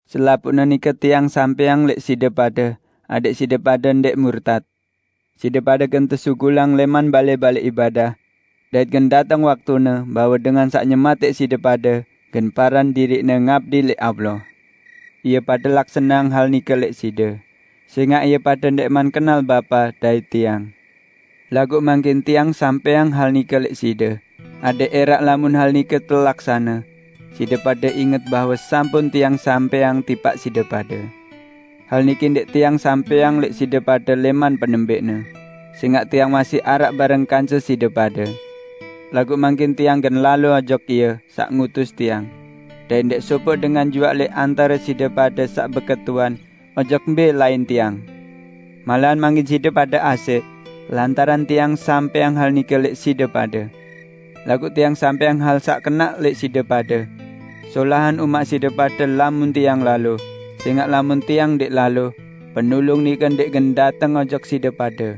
Selapuqne nike Tiang sampẽang lẽq side pade, adẽq side pade ndẽq murtat. Side pade gen tesugulang lẽman balẽ-balẽ ibadah. Dait gen dateng waktune bahwe dengan saq nyematẽq side pade gen paran diriqne ngabdi lẽq Allah. Ie pade laksaneang hal nike lẽq side, sẽngaq ie pade ndẽqman kenal Bapa dait Tiang. Laguq mangkin Tiang sampẽang hal nike lẽq side, adẽq ẽraq lamun hal nike telaksane, side pade inget bahwe sampun Tiang sampẽang tipaq side pade." "Hal niki ndẽq Tiang sampẽang lẽq side pade lẽman penembẽqne, sẽngaq Tiang masih araq bareng kance side pade. Laguq mangkin Tiang gen lalo ojok Ie saq ngutus Tiang; dait ndẽq sopoq dengan juaq lẽq antare side pade saq beketuan ojok mbẽ lain Tiang. Malahan mangkin side pade asẽq, lantaran Tiang sampẽang hal nike lẽq side pade. Laguq Tiang sampẽang hal saq kenaq lẽq side pade: Solahan umaq side pade lamun Tiang lalo; sẽngaq lamun Tiang ndẽq lalo, Penulung nike ndẽq gen dateng ojok side pade.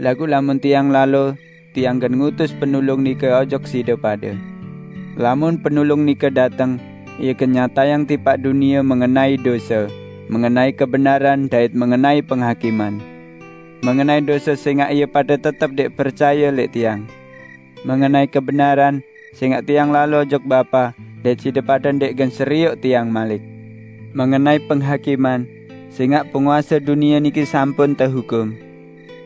Laguq lamun Tiang lalo, Tiang gen ngutus Penulung nike ojok side pade. Lamun Penulung nike dateng, Ie gen nyatayang tipaq dunie mengenai dose, mengenai kebenaran, dait mengenai penghakiman. Mengenai dose, sẽngaq ie pade tetep ndẽq percaye lẽq Tiang; mengenai kebenaran, sẽngaq Tiang lalo ojok Bapa dait side pade ndẽq gen serioq Tiang malik; mengenai penghakiman, sẽngaq penguase dunie niki sampun tehukum.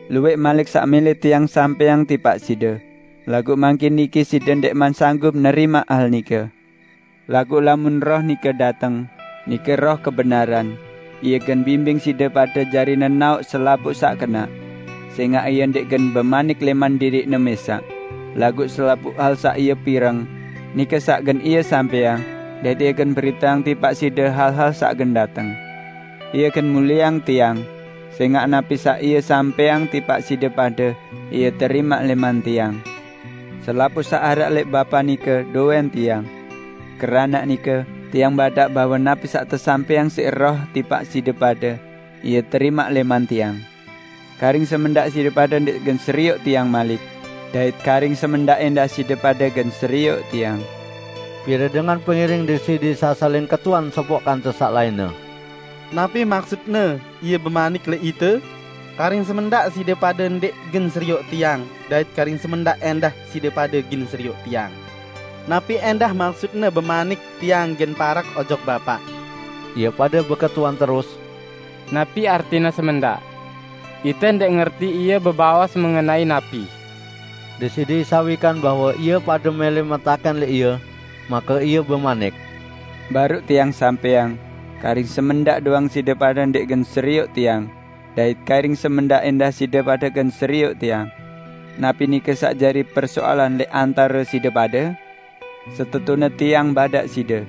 Luwẽq malik saq mẽlẽ Tiang sampẽang tipaq side, laguq mangkin niki side ndẽqman sanggup nerimaq hal nike. Laguq lamun Roh nike dateng, nike Roh kebenaran, Ie gen bimbing side pade jari nenaoq selapuq saq kenaq; sẽngaq Ie ndẽq gen bemanik lẽman diriq-Ne mẽsaq, laguq selapuq hal saq Ie pireng, nike saq gen Ie sampẽang dait Ie gen beriteang tipaq side hal-hal saq gen dateng. Ie gen mulieang Tiang, sẽngaq napi saq Ie sampẽang tipaq side pade Ie terimaq lẽman Tiang. Selapuq saq araq lẽq Bapa nike dowẽn Tiang. Keranaq nike, Tiang badaq bahwe napi saq tesampẽang siq Roh tipaq side pade, Ie terimaq lẽman Tiang." "Karing semendaq side pade ndẽq gen serioq Tiang malik, dait karing semendaq ẽndah side pade gen serioq Tiang." Pire dengan pengiring Deside Isa saling ketuan sopoq kance saq lainne, "Napi maksutne Ie bemanik lẽq ite: 'Karing semendaq side pade ndẽq gen serioq Tiang, dait karing semendaq ẽndah side pade gen serioq Tiang'? Napi ẽndah maksut-Ne bemanik, 'Tiang gen parek ojok Bapa'?" Ie pade beketuan terus, "Napi artine, 'semendaq'? Ite ndẽq ngerti Ie bebaos mengenai napi!" Deside Isa wikan bahwe ie pade mẽlẽ metakẽn lẽq Ie, make Ie bemanik, "Baruq Tiang sampẽang, 'Karing semendaq doang side pade ndẽq gen serioq Tiang, dait karing semendaq ẽndah side pade gen serioq Tiang.' Napi nike saq jari persoalan lẽq antare side pade? Setetune Tiang badaq side,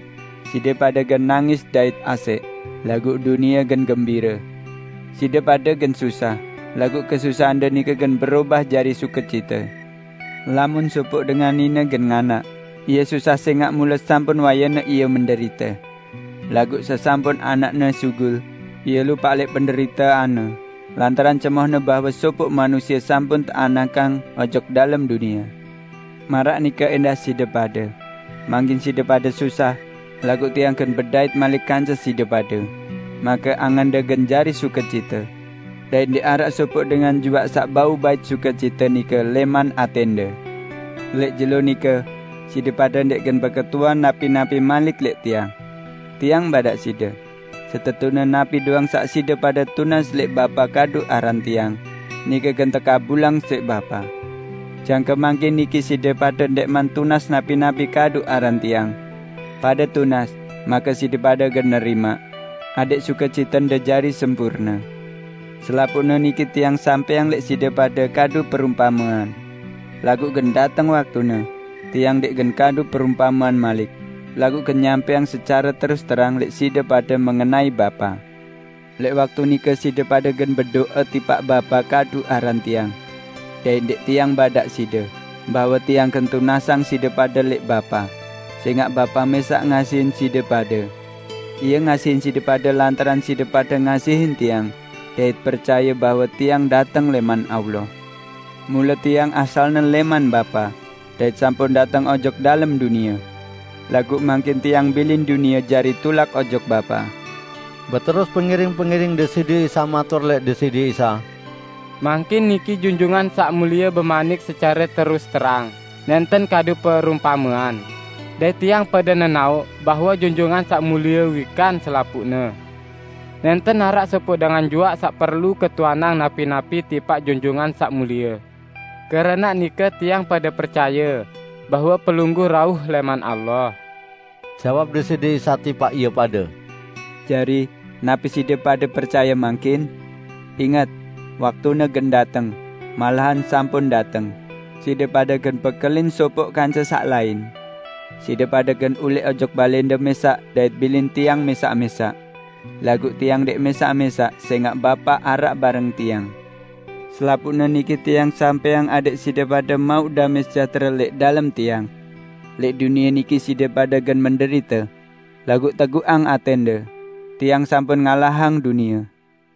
side pade gen nangis dait asẽq, laguq dunie gen gembire. Side pade gen susah, laguq kesusahande nike gen berobah jari sukecite. Lamun sopoq dengan nine gen nganak, ie susah sẽngaq mule sampun wayene ie menderite. Laguq sesampun anakne sugul, ie lupaq lẽq penderiteanne lantaran cemohne bahwe sopoq manusie sampun teanakang ojok dalem dunie. Maraq nike ẽndah side pade: Mangkin side pade susah, laguq Tiang gen bedait malik kance side pade, make angende gen jari sukecite; dait ndẽq araq sopoq dengan juaq saq bau bait sukecite nike lẽman atẽnde. Lẽq jelo nike, side pade ndẽq gen beketuan napi-napi malik lẽq Tiang. Tiang badaq side: Setetune napi doang saq side pade tunas lẽq Bapa kadu aran Tiang, nike gen tekabulang siq Bapa. Jangke mangkin niki side pade ndẽqman tunas napi-napi kadu aran Tiang. Pade tunas, make side pade gen nerimaq, adẽq sukecitende jari sempurne." "Selapuqne niki Tiang sampẽang lẽq side pade kadu perumpamean. Laguq gen dateng waktune, Tiang ndẽq gen kadu perumpamean malik, laguq gen nyampẽang secare terus-terang lẽq side pade mengenai Bapa. Lẽq waktu nike side pade gen bedo'e tipaq Bapa kadu aran Tiang. Dait ndẽq Tiang badaq side, bahwe Tiang gen tunasang side pade lẽq Bapa, sẽngaq Bapa mẽsaq ngasihin side pade. Ie ngasihin side pade lantaran side pade ngasihin Tiang, dait percaye bahwe Tiang dateng lẽman Allah. Mule Tiang asalne lẽman Bapa, dait sampun dateng ojok dalem dunie. Laguq mangkin Tiang bilin dunie jari tulak ojok Bapa." Beterus pengiring-pengiring Deside Isa matur lẽq Deside Isa, "Mangkin niki Junjungan Saq Mulie bemanik secare terus-terang, nẽnten kadu perumpamean, dait tiang pade nenaoq bahwe Junjungan Saq Mulie wikan selapuqne. Nẽnten araq sopoq dengan juaq saq perlu ketuanang napi-napi tipaq Junjungan Saq Mulie. Keranaq nike tiang pade percaye bahwe Pelungguh rauh lẽman Allah." Jawab Deside Isa tipaq ie pade, "Jari, napi side pade percaye mangkin? Inget! Waktune gen dateng, malahan sampun dateng, side pade gen bekelin sopoq kance saq lain. Side pade gen ulẽq ojok balẽnde mẽsaq dait bilin Tiang mẽsaq-mẽsaq. Laguq Tiang ndẽq mẽsaq-mẽsaq sẽngaq Bapa araq bareng Tiang. Selapuqne niki Tiang sampẽang adẽq side pade mauq damẽ sejahtere lẽq dalem Tiang. Lẽq dunie niki side pade gen menderite. Laguq teguqang atẽnde! Tiang sampun ngalahang dunie!"